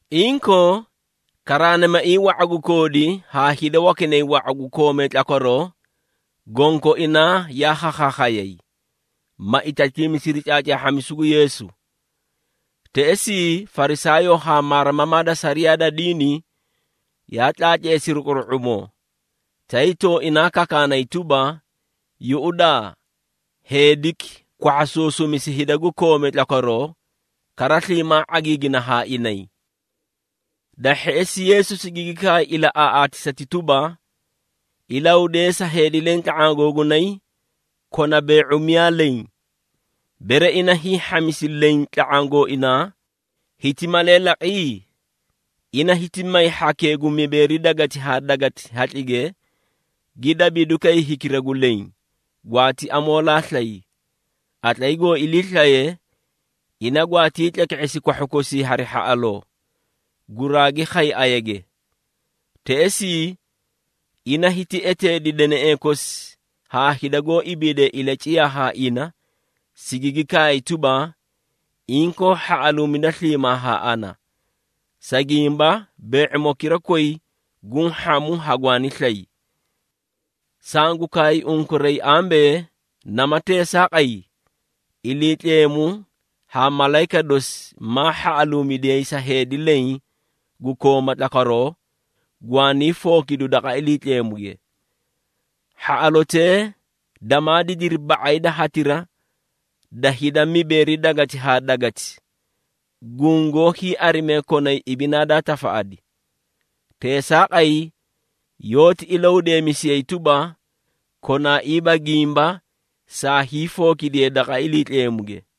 Inkoo, karaanimaiĩ wa⁄a gu koodi haa hida wakinay wa⁄a gu koomee tlakwaroo, gonkoinaa yaa khakhaakhayay, ma itatiimisiri caacaahhamisu gu Yeesu. Teꞌesii, Farisaayoo haa maarimamaa da sariyaa da diini yaa tlaatleesiri quru⁄umoo, tay tooinaa kakaanay tuba, “Yuꞌudaa, heediki kwahhasuusumisi hida gu koomee tlakwaroo, kara sliimaa ⁄agiigina haa inay.” Da hheꞌesi, Yeesu sigigi kaay ilaꞌaaꞌaatisati tuba, “Ilahudeesa heedi leẽ tla⁄aã googunay kona bee⁄u miyaa leẽ. Bere ina hiĩ hhamisi leẽ tla⁄aã gooinaa, hiti malee laqi? Ina hiti may hhakee gu mibeeri gweleti haa gweleti hatlige, gi dabiidukay hikira gu leẽ, gwaati amoolaa slay. Qatlay goo iliislaye, ina gwaatii tleke⁄esi kwahhu kosii hari hhaꞌaloo, guraagi khay ayage. Teꞌesii, ina hiti eteedi deneꞌee kosi haa hida goó ibiidee ilaciyaa haa ina, sigigi kaay tuba, ‘Inkoo hhaꞌaluumida sliimaa haa ana, sa gimba bee⁄imokira koyi guũ hhamu hagwaani slay!’ Sangu kaay unkuray ambee, nama teesaaqay, Iliitleemu haa malayika dosi maa hhaꞌaluumidiyay sa heedi leẽ gu kooma tlakwaroo, gwaanii fookidu daqa Iliitleemuge. Hhaꞌalotee damaa didiri ba⁄ay da hatira da hida mibeeri gweleti haa gweleti, gungoó hiiarimee konay ibinaa daa tafaꞌadi. Teesaaqay yoóti ilahudeemisiyay tuba, konaaiiba gimba saa hiifookidiyee daqa Iliitleemuge.”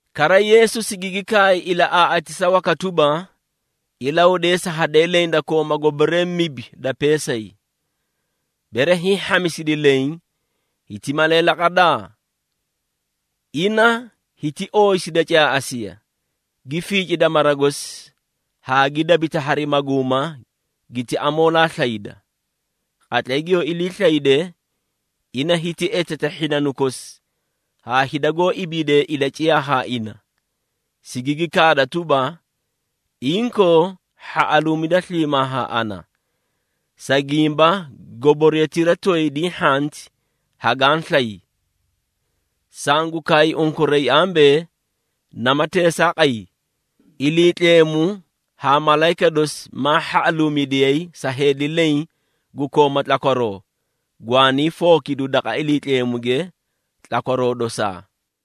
Kara, Yeesu sigigi kaay ilaꞌaaꞌaatisa waka tuba, “Ilahudeesa hadee leẽ da kooma goboree mibi da peesay. Bere hiĩ hhamisidi leẽ, hiti malee laqada? Ina hiti ooyisida caaꞌasiya, gi fiicida mara gosi haa gi dabita hari maguuma giti amoolaa slayda. Qatlay giyoo ilii slayde, ina hiti eteta hhinanu kosi haa hida goó ibiidee ilaciyaa haa ina, sigigi kaada tuba, ‘Inkoo, hhaꞌaluumida sliimaa haa ana, sa gimba goboriyatira toyi diĩ hhanti, hagaã slay!’ Sangu kaay unkuray ambee, nama teesaaqay, Iliitleemu haa malayika dosi maa hhaꞌaluumidiyay sa heedi leẽ gu kooma tlakwaroo, gwaanii fookidu daqa Iliitleemuge tlakwaroo dosaa.”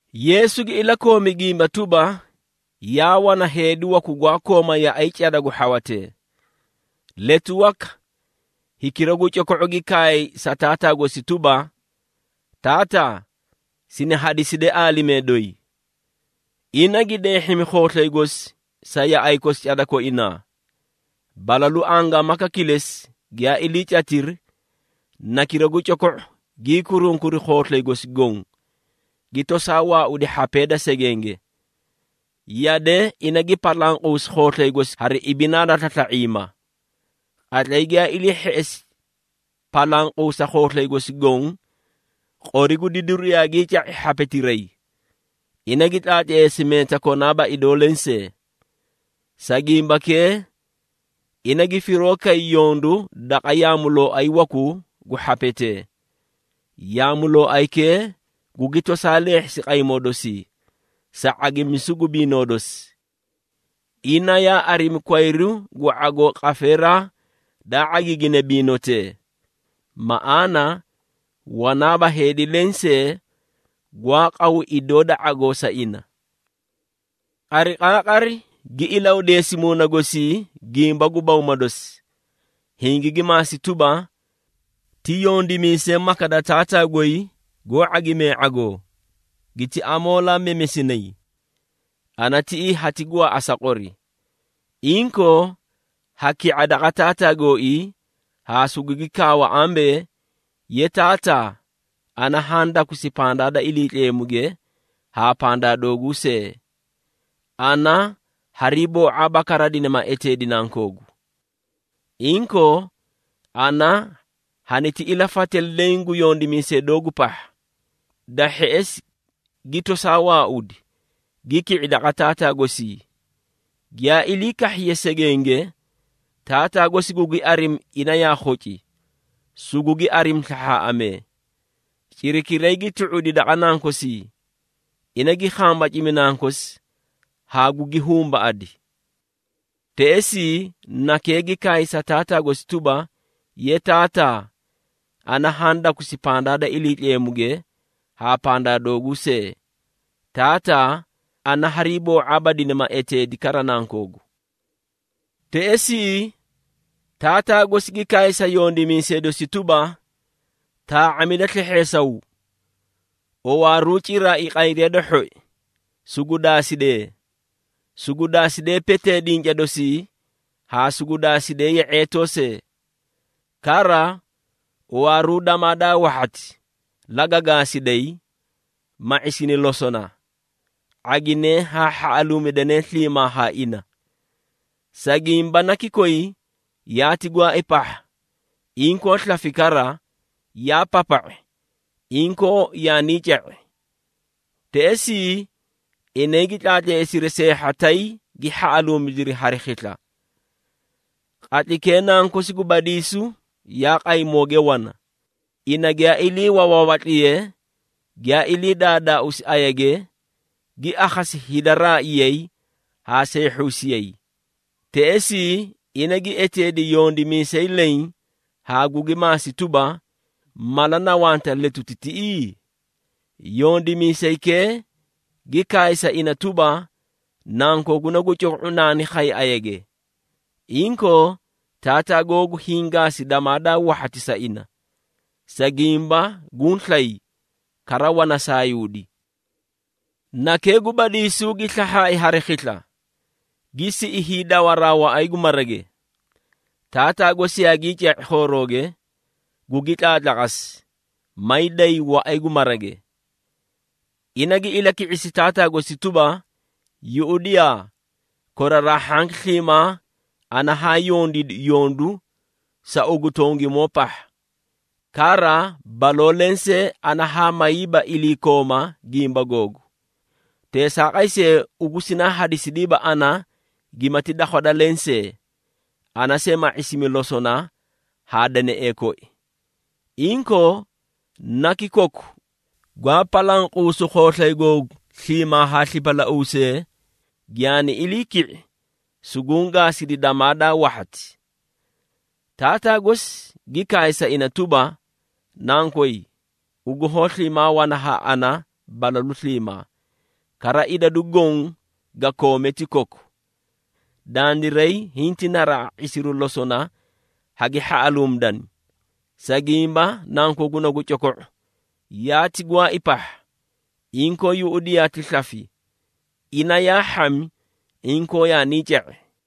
Yeesu gi ilakoomi gimba tuba, “Yaa wana heedi waku gwaa kooma yaꞌay cada gu hhawatee. Letu waka, hikira gu coko⁄u gi kaay sa taataa gosi tuba, ‘Taataa, sini hadiside aalimee doyi.’ Ina gi deehhimi khooslay gosi sa yaꞌay kosi cada koinaa. Balalu angaamaka kilesi giyaa iliicatiri, nakira gu coko⁄u gii kurunkuri khooslay gosi goõ, gi tosaa waaudi hhapee da segenge. Yade ina gi palanquusi khooslay gosi hari ibinaa da slasla⁄iima. Qatlay giyaa ilii hheꞌesi palanquusa khooslay gosi goõ, qori gu didiru yaagii ca⁄i hhapetiray. Ina gi tlaatleesi meeta konaaba idoo lensee. Sa gimbakee, ina gi firoo kay yondu daqa yaamulooay wakuu gu hhapetee. Yaamulooaykee gugi tosaa leehhisi qaymoo dosii, sa ⁄agimisu gu biinoo dosi. Ina yaa arimi kwayru gu ⁄agoo qafeeraa daa ⁄agiiginee biinotee, maꞌaana wanaaba heedi lensee gwaa qaw idoo da ⁄agoo sa ina. Qariqaaqari, gi ilahudeesi muuna gosii gimba gu bawma dosi, hingigi maasi tuba, ‘Ti yondimiisee maka da taataa goy goó ⁄agimee ⁄agoo, giti amoolaa memesinay! Ana tiꞌii hati gwaaꞌa sa qori!’ Inkoo, ha ki⁄a daqa taataa gooii haa sugugi kaawa ambee, ‘Ye taataa, ana haã dakusi pandaa da Iliitleemuge haa pandaa dooguu see. Ana hariiboo⁄aaba kara dinima eteedi nankoogu. Inkoo, ana haniti ilafate leẽ gu yondimiisee doogu pahha.’ Da hheꞌesi, gi tosaa waaudi, gi ki⁄i daqa taataa gosii. Giyaa ilii kahhiye segenge, taataa gosi gugi arimi ina yaa khoci, sugugi arimi slahhaaꞌamee. Cirakiray gi tu⁄udi daqa nankosii, ina gi khambacimi nankosi haa gugi humbaꞌadi. Teꞌesii, nakee gi kaay sa taataa gosi tuba, ‘Ye taataa, ana haã dakusi pandaa da Iliitleemuge haa pandaa dooguu see. Taataa, ana hariiboo⁄aaba dinima eteedi kara nankoogu.’ Teꞌesii, taataa gosi gi kaay sa yondimiisee dosi tuba, ‘Taa⁄amida slehheesaw! Owaaruu ciraai qayriya da hhoi, sugu daasidee, sugu daasidee petee dinca dosii haa sugu daasidee ye⁄eetoo see. Kara, owaaruu damaa daa wahhati, laga gaasiday, ma ⁄isini losona. ⁄aginee haa hhaꞌaluumidanee sliimaa haa ina. Sa gimba naki koyi yaati gwaai pahha, inkoo slafi kara, yaa papa⁄i, inkoo yaanii ca⁄i.’ Teꞌesii, inay gi tlaatleesiri seehha tay, gi hhaꞌaluumidiri hari khisla. Qatlaykee nankosi gu badiisu yaa qaymooge wana, ina giyaa ilii wawaawatliye, giyaa ilii daadaausi ayage, gi akhasi hida raaiyay haa seehhuusiyay. Teꞌesii, ina gi eteedi yondimiisay leẽ haa gugi maasi tuba, ‘Mala na wanta letuti tiꞌii?’ Yondimiisaykee gi kaay sa ina tuba, ‘Nankooguna gu coko⁄u naani khay ayage. Inkoo taataa googu hiĩ gaasi damaa daa wahhati sa ina, sa gimba guũ slay kara wana saayuudi.’ Nakee gu badiisu gi slahhaai hari khisla, gi siꞌi hiidawaraa waꞌay gu marage. Taataa gosi yaagii ca⁄i khoorooge, gugi tlaatlaqasi, maay day waꞌay gu marage. Ina gi ilaki⁄isi taataa gosi tuba, ‘Yuꞌudiyaa! Koraraa hhanki sliimaa ana haã yondiidi yondu sa ugu tongimoo pahha. Kara, baloo lensee haa mayiiba iliikooma gimba googu. Teesaaqay see, ugu sinaa hadisidiiba ana gimati dakhwada lensee, ana see ma ⁄isimi losona haa deneꞌee koi. Inkoo, naki koku gwaa palanquusu khooslay googu sliimaa haa slipalauusee, giyaani ilii ki⁄i, suguũ gaasidi damaa daa wahhati.’ Taataa gosi gi kaay sa ina tuba, ‘Nankoy, ugu hoó sliimaa wana haa ana balalu sliimaa, kara idadu goõ ga koome ti koku. Dandiray hinti naraꞌa ⁄isiru losona hagi hhaꞌaluumidana, sa gimba nankooguna gu coko⁄u, yaati gwaai pahha, inkoo yuꞌudiyaa ti slafi. Ina yaa hhami, inkoo yaanii ca⁄i.’”